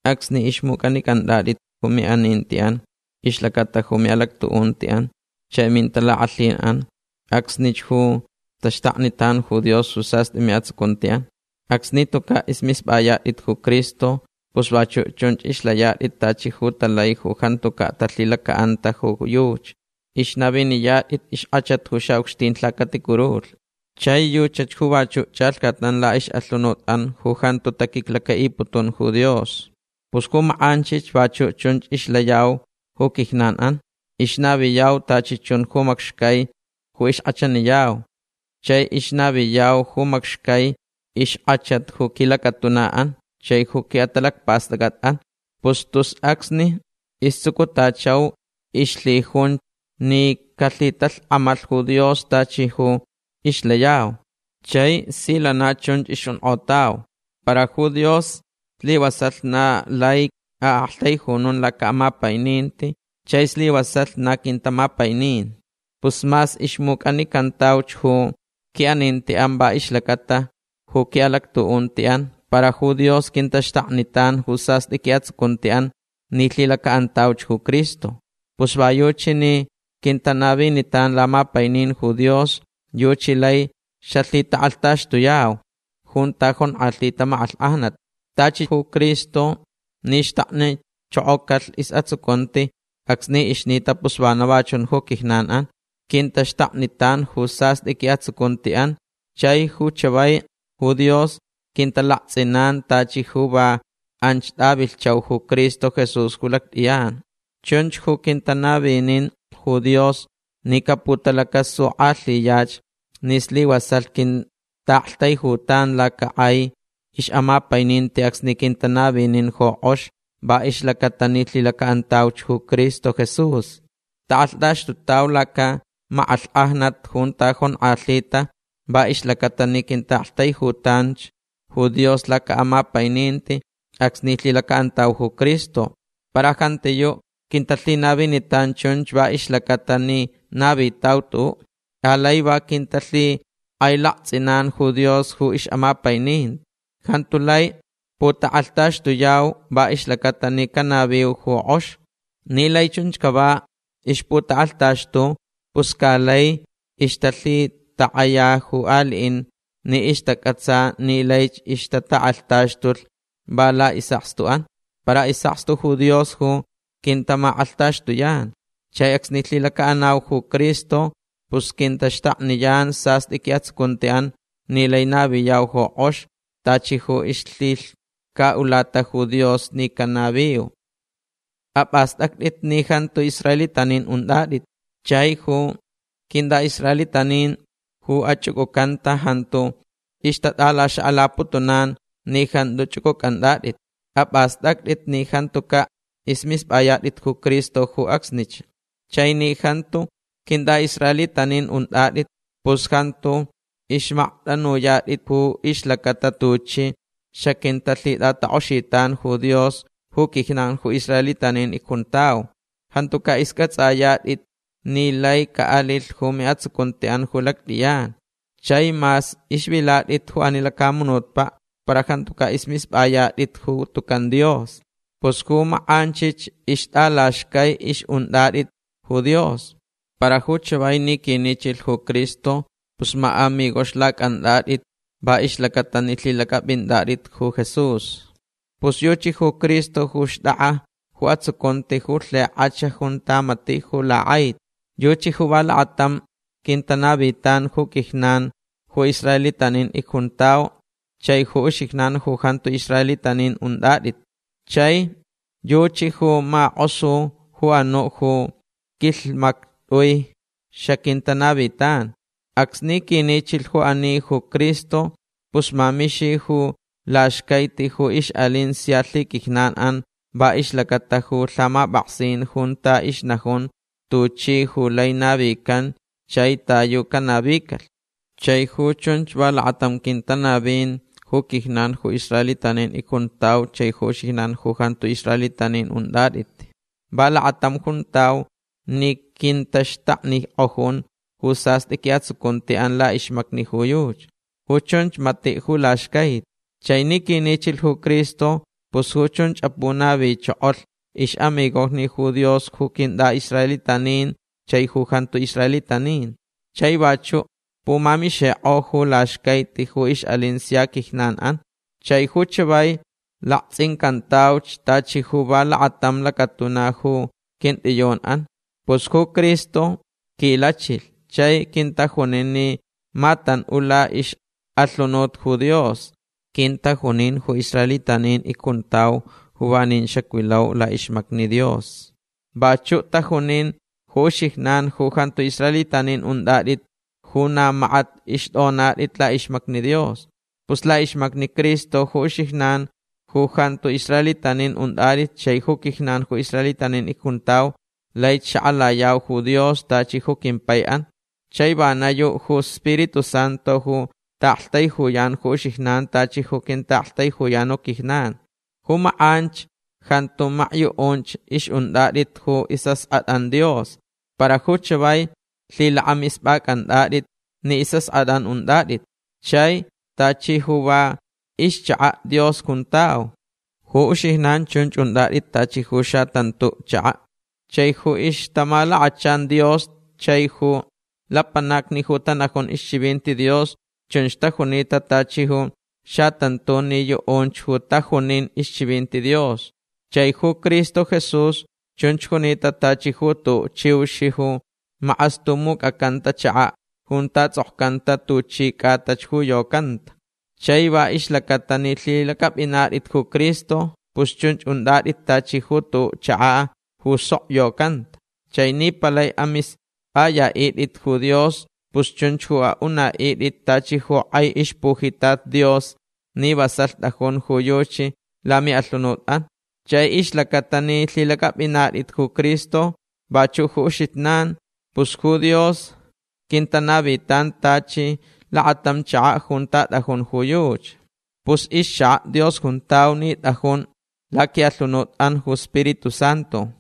Acsni ixmucʼanicʼantʼatʼit ju miʼanintiʼan ixlacata ju miʼalactuʼuntiʼan chai mintalakʼalhinʼan acsnich ju taxtaknitan ju Dios ju sastʼi miʼatsucuntiʼan. Acsni tucaʼ ismispʼayatʼit ju Cristo pus vachuʼ chunch ixlayatʼit tachi ju talai ju jantucaʼ talhilacaʼanta ju yuchi. Ixnaviniyatʼit ixkʼachat ju xaʼucxtin lhacaticurulhni. Chai yuchach ju vachuʼ chʼalhcatnan laʼixʼalhunutʼan ju jantu taquiclacaʼiputun ju Dios. Pus ju makʼanchich vachuʼ chunch ixlayau ju quijnanʼan. Ixnaviyauch tachi chun ju macxcai ju ixkʼachaniyau. Chai ixnaviyau ju macxcai ixkʼachat ju quilacatunaʼan chai ju quiʼatalacpastʼacʼatʼan. Pus tus acsni istsucutachauch ixlhijunch ni calhitalhkʼamalh ju Dios tachi ju ixlayauch. Chai si lana chun ixjunkʼotauch. Para ju Dios slivasalh na lai aʼaktaijunun lacaʼamapaininti chai slivasalh na quintamapainin. Pus mas ixmucʼanicantauch ju quiʼanintiʼan va ixlacata ju quiʼalactuʼuntiʼan para ju Dios quintaxtaknitan ju sastʼi quiʼatsucuntiʼan ni lhilacaʼantauch ju Cristo. Pus va yuchi ni quintanavinitan lamapainin ju Dios yuchi lai xalhitakʼalhtaxtuyau junta jonkʼalhita makʼalhkʼajnat. Tachi ju Cristo ni xtaknichokocalh isʼatsucunti acsni ixnita pus vana va chun ju quijnanʼan. Quintaxtaknitan ju sastʼi quiʼatsucuntiʼan chai ju chavai ju Dios quintalaktsʼinan tachi ju va anch tʼavilhchau ju Cristo Jesús ju lactʼiyan. Chunch ju quintanavinin ju Dios ni caputalacasukʼalhiyach ni slivasalh quintaʼaktaijutan lacakʼai ixʼamapaininti acsni quintanavinin ju kʼox va ixlacaʼatalh ni lhilacaʼantauch ju Cristo Jesús. Takʼalhtaxtutauch lacamakʼalhkʼajnat junta jonkʼalhita va ixlacaʼatalh ni quintaʼaktaijutanch ju Dios lacaʼamapaininti acsni lhilacaʼantauch ju Cristo. Para jantiyuʼ quintalhinavinitan chunch va ixlacaʼatalh ni navitau tuʼuʼ. Alai va quintalhikʼailaktsʼintan ju Dios ju ixʼamapaininti. Jantu lai putakʼalhtaxtuyau va ixlacaʼatalh ni canaviuch ju kʼox. Ni lai chunch cava ixputakʼalhtaxtu pus ca laich ixtalhitakʼaya ju aliʼin ni ixtacʼatsa ni laich ixtatakʼalhtaxtulh va laʼisʼakstuʼan. Para isʼakstu ju Dios ju quintamakʼalhtaxtuyan. Chai acsni lhilacaʼanau ju Cristo pus quintaxtakniyan sastʼi quiʼatsucuntiʼan ni lai naviyau ju kʼox tachi ju ixlhilhcaʼulata ju Dios ni canaviu. Apʼastʼactʼit ni jantu israelitanin untʼatʼit. Chai ju quintʼaʼisraelitanin ju achʼucʼucanta jantu ixtatʼalaxakʼalaputunan ni jantu chʼucʼucʼantʼatʼit. Apʼastʼactʼit ni jantucaʼ ismispʼayatʼit ju Cristo ju acsnich. Chai ni jantu quintʼaʼisraelitanin untʼatʼit pus jantu ixmaktʼanuyatʼit ju ixlacata tuchi xaquintalhitʼatakʼoxitan ju Dios ju quijnan ju israelitanin icjuntau. Jantucaʼ iscʼatsʼayatʼit ni laich caʼalilh ju miʼatsucuntiʼan ju lactʼiyan. Chai mas ixvilatʼit ju ani lacamunutpaʼ para jantucaʼ ismispʼayatʼit ju tucan Dios. Pus ju makʼanchich ixtʼalaxcai ixʼuntʼatʼit ju Dios. Para ju chavai ni quinichilh ju Cristo pus maʼamigoxlacʼantʼatʼit va ixlacaʼatalh ni lhilacʼapʼintʼatʼit ju Jesús. Pus yuchi ju Cristo ju xtʼakʼa ju atsucunti ju lhikʼach junta matiʼ ju lakʼaiti. Yuchi ju va lakatam quintanavin ju quijnan ju israelitanin icjuntau chai ju uxijnan ju jantu israelitanin untʼatʼit. Chai yuchi ju makʼosulh ju anuʼ ju quilhmaktʼui xaquintanavitan. Acsni quinichilh ju ani ju Cristo pus mamixilh ju laxcaiti ju ixʼalin sia lhiquijnanʼan va ixlacata ju lhamapʼaksin junta ixnajun tuchich ju lai navican chai ta yu canavicalh. Chai ju chunch va lakatam quintanavin ju quijnan ju israelitanin icjuntau chai ju uxijnan ju jantu israelitanin untʼatʼit. Va lakatam juntau ni quintaxtaknikʼojun ju sastʼi quiʼatsucuntiʼan laʼixmacni ju yuchi. Ju chunch matiʼ ju laxcaiti. Chai ni quinichilh ju Cristo pus ju chunch apunavichokolh ixʼamigojni ju Dios ju quintʼaʼisraelitanin chai ju jantu israelitanin. Chai vachuʼ pumamixikʼo ju laxcaiti ju ixʼalin sia quijnanʼan. Chai ju chavai laktsʼincantauch tachi ju va lakatam lacatuna ju quintʼiyunʼan. Pus ju Cristo quilachilh chai quintajunin ni matanʼula ixʼalhunut ju Dios. Quintajunin ju israelitanin icjuntau ju vanin xacvilau laʼixmacni Dios. Vachuʼ tajunin ju uxijnan ju jantu israelitanin untʼatʼit ju na makat ixtʼonatʼit laʼixmacni Dios. Pus laʼixmacni Cristo ju uxijnan ju jantu israelitanin untʼatʼit chai ju quijnan ju israelitanin icjuntau laich xakʼalayau ju Dios tachi ju quimpaiʼan. Chai vana yuʼ ju Spiritu Santu ju taʼaktaijuyan ju uxijnan tachi ju quintaʼaktaijuyan ju quijnan. Ju makʼanch jantu makyuʼunch ixʼuntʼatʼit ju isʼaskʼatʼan Dios. Para ju chavai lhilakʼamispʼacʼanatʼit ni isʼaskʼatʼan untʼatʼit. Chai tachi ju va ixchakaʼ Dios juntau. Ju uxijnan chunch untʼatʼit tachi ju xatantuʼ chakaʼ. Chai ju ixtamalakachan Dios chai ju lapanacni ju tanajun ixchivinti Dios chunch tajunita tachi ju xatantun ni yuʼunch ju tajunin ixchivinti Dios. Chai ju Cristo Jesús chunch junita tachi ju tuʼuʼ chiux ju makʼastumucʼacanta chakaʼ junta tsʼokcanta tuchi cʼatach ju yocanta. Chai va ixlacata ni lhilacʼapʼinatʼit ju Cristo pus chunch untʼatʼit tachi ju tuʼuʼ chakaʼ ju sok yocanta. Chai ni palai amispʼayaʼitʼit ju Dios pus chunch ju aʼunaʼitʼit tachi ju kʼai ixpujitat Dios ni vasalh tʼajun ju yuchi lamiʼalhunutʼan. Chai ixlacata ni lhilacʼapʼinatʼit ju Cristo vachuʼ ju uxijnan pus ju Dios quintanavitan tachi lakatam chakaʼ junta tʼajun ju yuchi. Pus ixchakaʼ Dios juntau ni tʼajun laquiʼalhunutʼan ju Spiritu Santu.